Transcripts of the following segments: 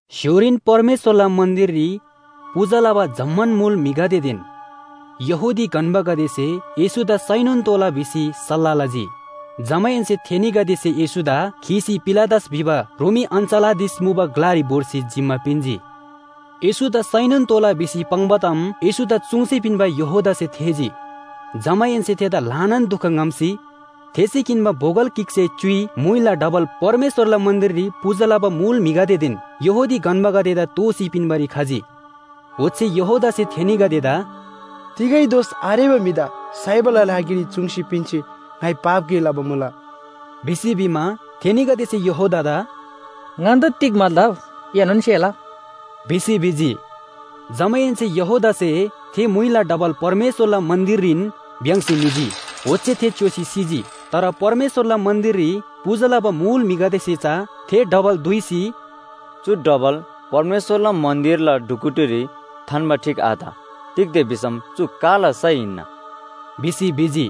स्‍य्‍होरीन परमेश्‍वरला मन्‍दिररी पूजा लबा जम्‍मान मुल म्‍हिगदेदेन यहूदी गन्‍बागदेसे येशूदा साइनोन तोःला भिसी सल्‍लाह लजी। जमाहेन्‍से थेनीगदेसे येशूदा खीसी पिलातस भिबा रोमी अञ्‍चलाधीश मुबा ग्‍लारी भोर्सी जिम्‍मा पिन्‍जी। येशूदा साइनोन तोःला भिसी पाङ्बा ताम येशूदा चुङ्सी पिन्‍बा यहूदासे थेःजी। जमाहेन्‍से थेदा ल्‍हानान दुख ङ्‍हम्‍सी थेसे किन्‍बा बोगल गिकसे च्‍युइ म्‍हुइला डबल परमेश्‍वरला मन्‍दिररी पूजा लबा मुल म्‍हिगदेदेन यहूदी गन्‍बागदेदा दोःसी पिन्‍बारी खजी। ओच्‍छे यहूदासे थेनीगदेदा “तिगै दोष आरेबा म्‍हिदा साइबाला लागिरी चुङ्सी पिन्‍सी ङाइ पाप गे लबा मुला” भिसी भिमा, थेनीगदेसे यहूदादा “ङन्‍दा तिग मतलब? एनोन सेला” भिसी भिजी। जमाहेन्‍से यहूदासे थे म्‍हुइला डबल परमेश्‍वरला मन्‍दिररीन भ्‍याङ्‍सी निजी, ओच्‍छे थे च्‍योसी सिजी। तर परमेश्‍वरला मन्‍दिररी पूजा लबा मुल म्‍हिगदेसे चा थे डबल दुइसी “चु डबल परमेश्‍वरला मन्‍दिरला ढुकुटीरी थान्‍बा ठीक आत। तिग्‍दा भिसम चु काला सय हिन्‍ना” भिसी भिजी।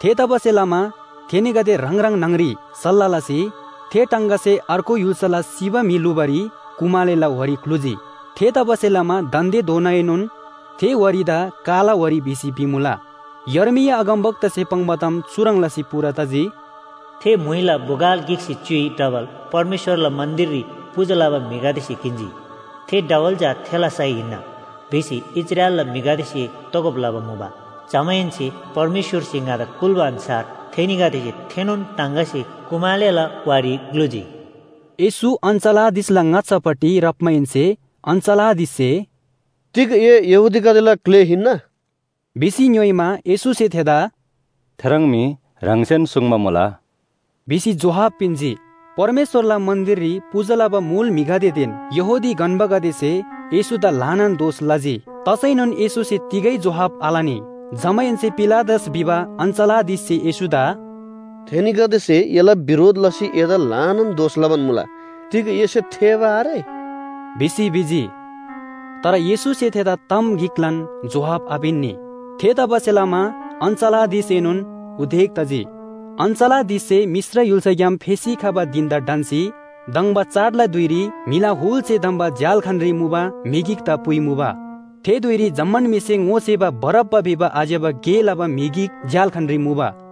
थेतबासेलमा थेनीगदे ह्राङ ह्राङ न्‍हङ‍री सल्‍लाह लसी थे टाङगासे अर्गु य्‍हुल्‍साला सिबा म्‍हि ल्‍हुबारी कुमालेला वारी ग्‍लुजी। थेतबासेलमा दान्‍देधोनाएनोन थे वारीदा काला वारी भिसी भिमुला। यर्मिया अगमवक्तासे पाङ्बा ताम चुह्रङ् लसी पूरा तजी, “थे म्‍हुइला बोगल गिकसे च्‍युइ डबल परमेश्‍वरला मन्‍दिररी पूजा लबा म्‍हिगदेसे किन्‍जी। थे डबल चा थेला सय हिन्‍ना भिसी इस्राएलला म्‍हिगदेसे तोगब लबा मुबा। जमाहेन्‍से परमेश्‍वरसे ङादा कुल्‍बा अन्‍छार थेनीगदेसे थेनोन टाङगासे कुमालेला बु ग्‍लुजी।” येशू अञ्‍चलाधीशला ङाच्‍छापट्टि राप्‍माहेन्‍से अञ्‍चलाधीशसे “तिग ए यहूदीगदेला ग्‍ले हिन्‍ना?” भिसी ङ्‌योइमा, येशूसे थेदा “थे मी ह्राङसेन सुङ्बा मुला” भिसी जोहाब पिन्‍जी। परमेश्‍वरला मन्‍दिररी पूजा लबा मुल म्‍हिगदेदेन यहूदी गन्‍बागदेसे येशूदा ल्‍हानान दोष लजी। तसैनोन येशूसे तिगै जोहाब आलनी। जमाहेन्‍से पिलातस भिबा अञ्‍चलाधीशसे येशूदा “थेनीगदेसे एला बिरोध लसी एदा ल्‍हानान दोष लबान मुला, तिग एसे थेःबा आरे?” भिसी भिजी। तर येशूसे थेदा ताम गिकलान जोहाब आपिन्‍नी। थेतबासेलमा अञ्‍चलाधीशएनोन उदेक तजी। अञ्‍चलाधीशसे मिश्र य्‍हुल्‍साग्‍याम फेसी खबा धिन‍दा ढन्‍सी धङ्बा चाडला धुइरी म्‍हिला हुलसे धम्‍बा झ्‍याल्‍खानरी मुबा म्‍हि गिकदा पुइमुबा। थे धुइरी जम्‍मान म्‍हिसे ङोसेबा बारब्‍बा भिबा आज्‍यबा गे लबा म्‍हि गिक झ्‍याल्‍खानरी मुबा।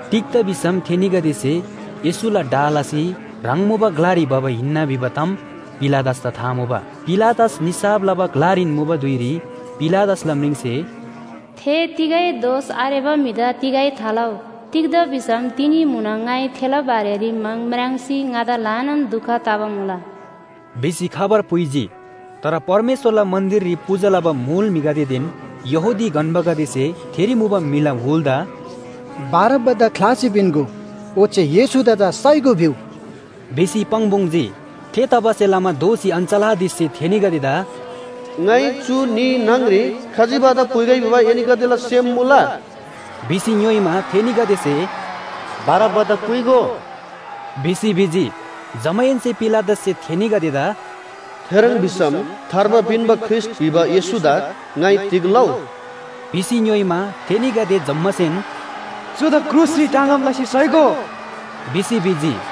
तिग्‍दा भिसम थेनीगदेसे येशूला डाह लसी ह्राङ मुबा ग्‍लारी भबा हिन्‍ना भिबा ताम पिलातसदा था मुबा। पिलातस निसाफ लबा ग्‍लारीन मुबा धुइरी पिलातसला म्रिङसे “थे तिगै दोष आरेबा म्‍हिदा तिगै थालउ। तिग्‍दा भिसम तिनी म्‍हुनङ ङाइ थेला बारेरी म्‍हङ म्राङ्सी ङादा ल्‍हानान दुख तबा मुला” भिसी खबर पुइजी। तर परमेश्‍वरला मन्‍दिररी पूजा लबा मुल म्‍हिगदेदेन यहूदी गन्‍बागदेसे थेरी मुबा म्‍हिला हुलदा “‘बारब्‍बादा ख्‍लासी पिन्‍गो। ओच्‍छे येशूदा चा साइगो’ भिउ” भिसी पाङ्‌पुङ्‌जी। थेतबासेलमा दोःसी अञ्‍चलाधीशसे थेनीगदेदा “ङाइ चु न्‍ही न्‍हङ‍री खजिबादा पुइगै भिबा एनीगदेला सेम मुला?” भिसी ङ्‌योइमा, थेनीगदेसे “बारब्‍बादा पुइगो” भिसी भिजी। जमाहेन्‍से पिलातससे थेनीगदेदा “थेह्रङ् भिसम थार्बा पिन्‍बा ख्रीष्‍ट भिबा येशूदा ङाइ तिग लउ?” भिसी ङ्‌योइमा, थेनीगदे जम्‍मासेन “चुदा क्रुसरी टाँगब लसी साइगो!” भिसी भिजी।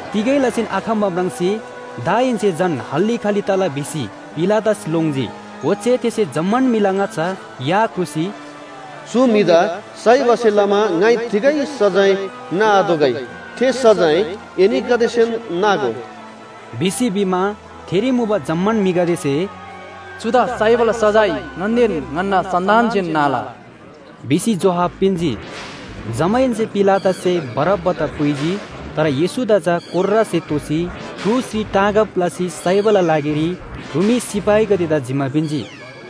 तिगै लसीन आखम्‍बा म्राङ्सी दाहेन्‍से झन हल्‍ली खल्‍ली तला भिसी पिलातस लोङ्जी। ओच्‍छे थेसे जम्‍मान म्‍हिला ङाच्‍छा या ख्रुसी “चु म्‍हिदा साइबासे लमा ङाइ तिगै सजाय नाआतोःगै, थे सजाय एनीगदेसेन नागो” भिसी भिमा, थेरी मुबा जम्‍मान म्‍हिगदेसे “चुदा साइबाला सजाय ङन्‍देन ङन्‍ना सन्‍तानसेन नाला” भिसी जोहाब पिन्‍जी। जमाहेन्‍से पिलातससे बारब्‍बादा पुइजी। तर येशूदा चा कोर्रासे तोसी क्रुसरी टाँगब लसी साइबाला लागिरी रोमी सिपाहीगदेदा जिम्‍मा पिन्‍जी।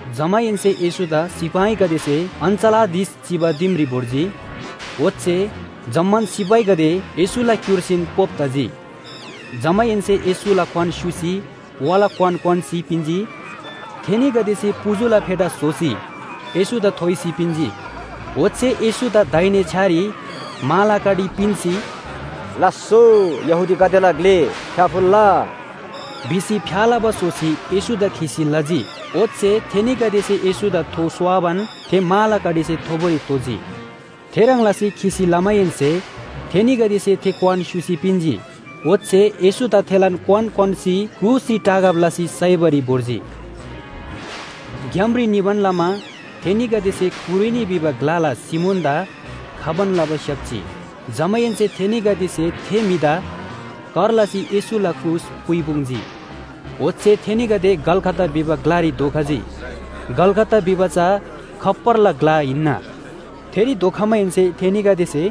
जमाहेन्‍से येशूदा सिपाहीगदेसे अञ्‍चलाधीश चिबा दिमरी भोर्जी। ओच्‍छे जम्‍मान सिपाहीगदे येशूला क्‍युर्सीन पोप तजी। जमाहेन्‍से येशूला क्‍वान स्‍युसी वाला क्‍वान क्‍वान्‍सी पिन्‍जी। थेनीगदेसे पुजुला फेटा स्‍होसी येशूदा थोइसी पिन्‍जी। ओच्‍छे येशूदा दाहिने छ्‌यारी माला कडी पिन्‍सी “लास्‍सो यहूदीगदेला ग्‍ले, फ्‍याफुल्‍ला” भिसी फ्‍या लबा स्‍होसी येशूदा खिसी लजी। ओच्‍छे थेनीगदेसे येशूदा थो स्‍वाबान थे माला कडीसे थोबोरी तोजी। थेह्रङ् लसी खिसी लमाहेन्‍से थेनीगदेसे थे क्‍वान स्‍युसी पिन्‍जी। ओच्‍छे येशूदा थेलान क्‍वान क्‍वान्‍सी क्रुसरी टाँगब लसी साइबारी भोर्जी। ग्‍यामरी निबान लमा थेनीगदेसे कुरेनी भिबा ग्‍लाला सिमोनदा खबान लबा स्‍याप्‍जी। जमाहेन्‍से थेनीगदेसे थे म्‍हिदा कर लसी येशूला क्रुस पुइपुङ्जी। ओच्‍छे थेनीगदे गलगथा भिबा ग्‍लारी धोखजी। गलगथा भिबा चा “खप्‍परला ग्‍ला” हिन्‍ना। थेरी धोखमाहेन्‍से थेनीगदेसे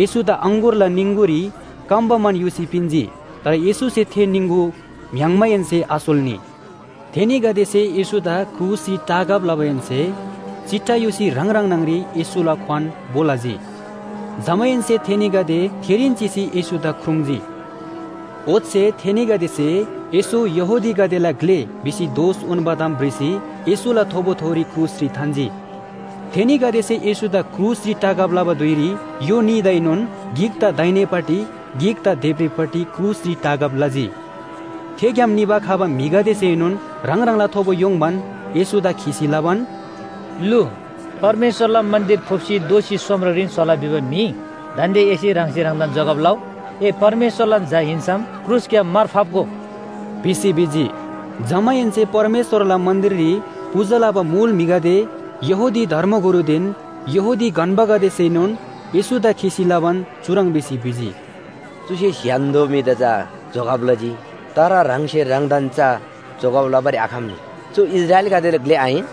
येशूदा अङगुरला निङगुरी कम्‍बा मान युसी पिन्‍जी। तर येशूसे थे निङगु म्‍य्‍हाङ्माहेन्‍से आसोल्‍नी। थेनीगदेसे येशूदा क्रुसरी टाँगब लमाहेन्‍से चिट्ठा युसी ह्राङ ह्राङ न्‍हङरी येशूला क्‍वान भो लजी। जमाहेन्‍से थेनीगदे थेरीन चिसी येशूदा ख्रुङ्जी। ओच्‍छे थेनीगदेसे “येशू यहूदीगदेला ग्‍ले” भिसी दोष उन्‍बा ताम भ्रिसी येशूला थोबोथोरी क्रुसरी थान्‍जी। थेनीगदेसे येशूदा क्रुसरी टाँगब लबा धुइरी य्‍हो न्‍हीदाएनोन गिकदा दाहिनेपट्टि गिकदा देब्रेपट्टि क्रुसरी टाँगब लजी। थे ग्‍याम निबा खबा म्‍हिगदेसेनोन ह्राङ ह्राङला थोबो य्‍होङ्बान येशूदा खिसी लबान, “लु, परमेश्‍वरला मन्‍दिर फुप्‍सी दोःसी सोमरेरीन स्‍होला भिबा म्‍हि दान्‍दे एसे ह्राङसे ह्राङदान जोगब लउ। ए परमेश्‍वरलान झा हिन्‍सम क्रुसग्‍याम मार फाप्‍गो” भिसी भिजी। जमाहेन्‍से परमेश्‍वरला मन्‍दिररी पूजा लबा मुल म्‍हिगदे, यहूदी धर्मगुरुदेन यहूदी गन्‍बागदेसेनोन येशूदा खिसी लबान चुह्रङ् भिसी भिजी, “चुसे स्‍य्‍हान्‍दो म्‍हिदा चा जोगब लजी, तर ह्राङसे ह्राङदान चा जोगब लबारी आखम्‍नी। चु इस्राएलीगदेला ग्‍ले आहिन!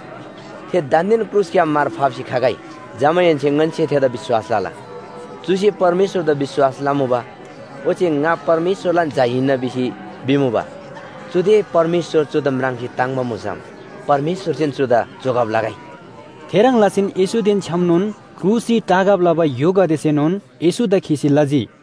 थे दान्‍देन क्रुसग्‍याम मार फाप्‍सी खगै। जमाहेन्‍से ङन्‍से थेदा विश्‍वास लला। चुसे परमेश्‍वरदा विश्‍वास लमुबा। ओच्‍छे ‘ङा परमेश्‍वरलान झा हिन्‍ना’ भिसी भिमुबा। चुदे परमेश्‍वर चुदा म्राङ्सी ताङ्‍बा मुसम परमेश्‍वरसेन चुदा जोगब लगै।” थेह्रङ् लसीन येशूदेन छ्‌यामनोन क्रुसरी टाँगब लबा य्‍होगदेसेनोन येशूदा खिसी लजी।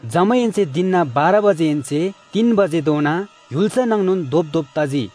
जमाहेन्‍से धिनना बाह्र बजेहेन्‍से तीन बजेधोना य्‍हुल्‍सा नाङनोन धोपधोप तजी।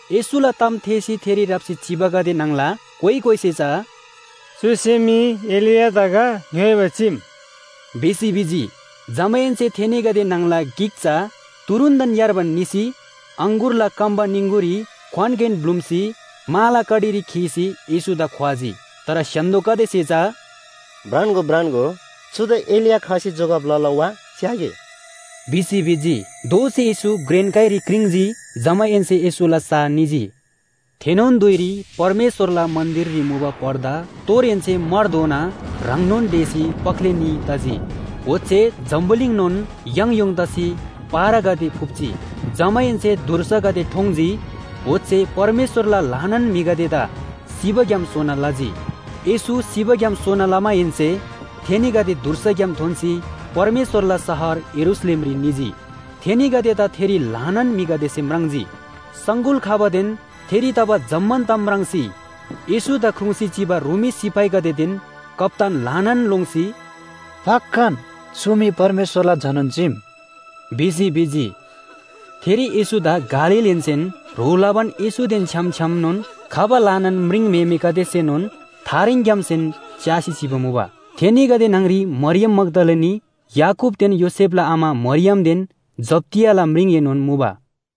येशूला ताम थेःसी थेरी राप्‍सी चिबागदे न्‍हङला कोइ कोइसे चा “चुसे मी एलियादा गा ङ्‌योइबा चीम” भिसी भिजी। जमाहेन्‍से थेनीगदे न्‍हङला गिक चा तुरुन्‍तन यार्बान निसी अङगुरला कम्‍बा निङगुरी क्‍वानगेन ब्‍लुम्‍सी माला कडीरी खीसी येशूदा ख्‍वाजी। तर स्‍य्‍हान्‍दोगदेसे चा “भ्रान्‍गो, भ्रान्‍गो, चुदा एलिया खसी जोगब लला वा? च्‍यागे” भिसी भिजी। दोःसी येशू घ्रेन काइरी क्रिङ्‌जी, जमाहेन्‍से येशूला सा निजी। थेनोन धुइरी परमेश्‍वरला मन्‍दिररी मुबा पर्दा तोरहेन्‍से मारधोना ह्राङनोन ढेसी पख्‍ले न्‍ही तजी। ओच्‍छे जम्‍बुलिङनोन याङयोङ तसी पहरागदे फुप्‍जी। जमाहेन्‍से धुर्सागदे ठोङ्‌जी, ओच्‍छे परमेश्‍वरला ल्‍हानान म्‍हिगदेदा सिबाग्‍याम सोना लजी। येशू सिबाग्‍याम सोना लमाहेन्‍से थेनीगदे धुर्साग्‍याम थोन्‍सी परमेश्‍वरला शहर यरूशलेमरी निजी। थेनीगदेदा थेरी ल्‍हानान म्‍हिगदेसे म्राङ्जी। सङगुल खबादेन थेरी तबा जम्‍मान ताम म्राङ्सी येशूदा ख्रुङ्‌सी चिबा रोमी सिपाहीगदेदेन कप्‍तान ल्‍हानान लोङ्सी “पक्‍कान चु मी परमेश्‍वरला झानोन चीम” भिसी भिजी। थेरी येशूदा गालीलहेन्‍सेन ह्रो लबान येशूदेन छ्‌याम छ्‌यामनोन खबा ल्‍हानान म्रिङम्‍हेमेगदेसेनोन थारेङग्‍यामसेन च्‍यासी चिबा मुबा। थेनीगदे न्‍हङ‍री मरियम मग्‍दलिनी, याकूबदेन योसेफला आमा मरियमदेन जब्‍दियाला म्रिङएनोन मुबा।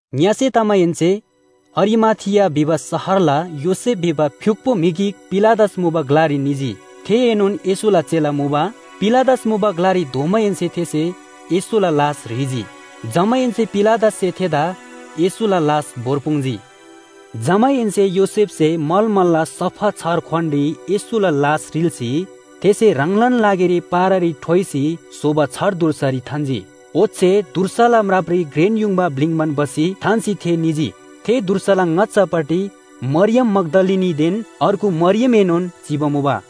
ङ्‍यसे तमाहेन्‍से अरिमाथिया भिबा शहरला योसेफ भिबा फ्‍युक्‍पो म्‍हि गिक पिलातस मुबा ग्‍लारी निजी। थेएनोन येशूला चेला मुबा। पिलातस मुबा ग्‍लारी धोमाहेन्‍से थेसे येशूला लास ह्रीजी। जमाहेन्‍से पिलातससे थेदा येशूला लास भोर्पुङ्जी। जमाहेन्‍से योसेफसे मलमलला सफा छार क्‍वानरी येशूला लास रिल्‍सी, थेसे ह्राङलान लागिरी पहरारी ठ्वाइसी स्‍होबा छार धुर्सारी थान्‍जी। ओच्‍छे धुर्साला म्रापरी घ्रेन युङबा ब्‍लिङ्बान भसी थान्‍सी थे निजी। थे धुर्साला ङाच्‍छापट्टि मरियम मग्‍दलिनीदेन अर्गु मरियमएनोन चिबा मुबा।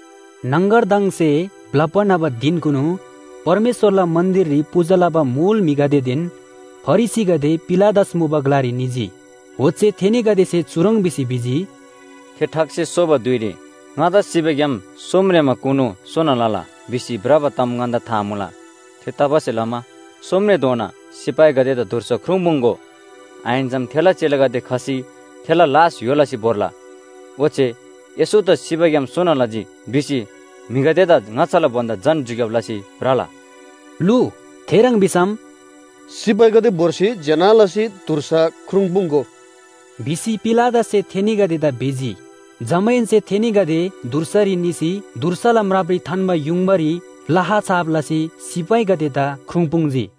न्‍हङगरदङसे ब्‍लप्‍बा न्‍हबा धिनकुनु परमेश्‍वरला मन्‍दिररी पूजा लबा मुल म्‍हिगदेदेन फरिसीगदे पिलातस मुबा ग्‍लारी निजी। ओच्‍छे थेनीगदेसे चुह्रङ् भिसी भिजी, “थे ठगसे सोबा धुइरी ‘ङादा सिबाग्‍याम सोमरेमाकुनु सोना लला’ भिसी भ्रबा ताम ङन्‍दा था मुला। थेतबासेलमा सोमरेमाधोना सिपाहीगदेदा धुर्सा ख्रुङ्पुङ्‍गो। आहिन्‍सम थेला चेलागदे खसी थेला लास य्‍हो लसी भोर्ला। ओच्‍छे ‘येशूदा सिबाग्‍याम सोना लजी’ भिसी म्‍हिगदेदा ङाच्‍छाला भन्‍दा झन झुक्‍याब लसी भ्रला।” लु, थेह्रङ् भिसम “सिपाहीगदे भोर्सी ज्‍यना लसी धुर्सा ख्रुङ्पुङ्‍गो” भिसी पिलातससे थेनीगदेदा भिजी। जमाहेन्‍से थेनीगदे धुर्सारी निसी धुर्साला म्रापरी थान्‍बा युङबारी लाहा छाप लसी सिपाहीगदेदा ख्रुङ्पुङ्जी।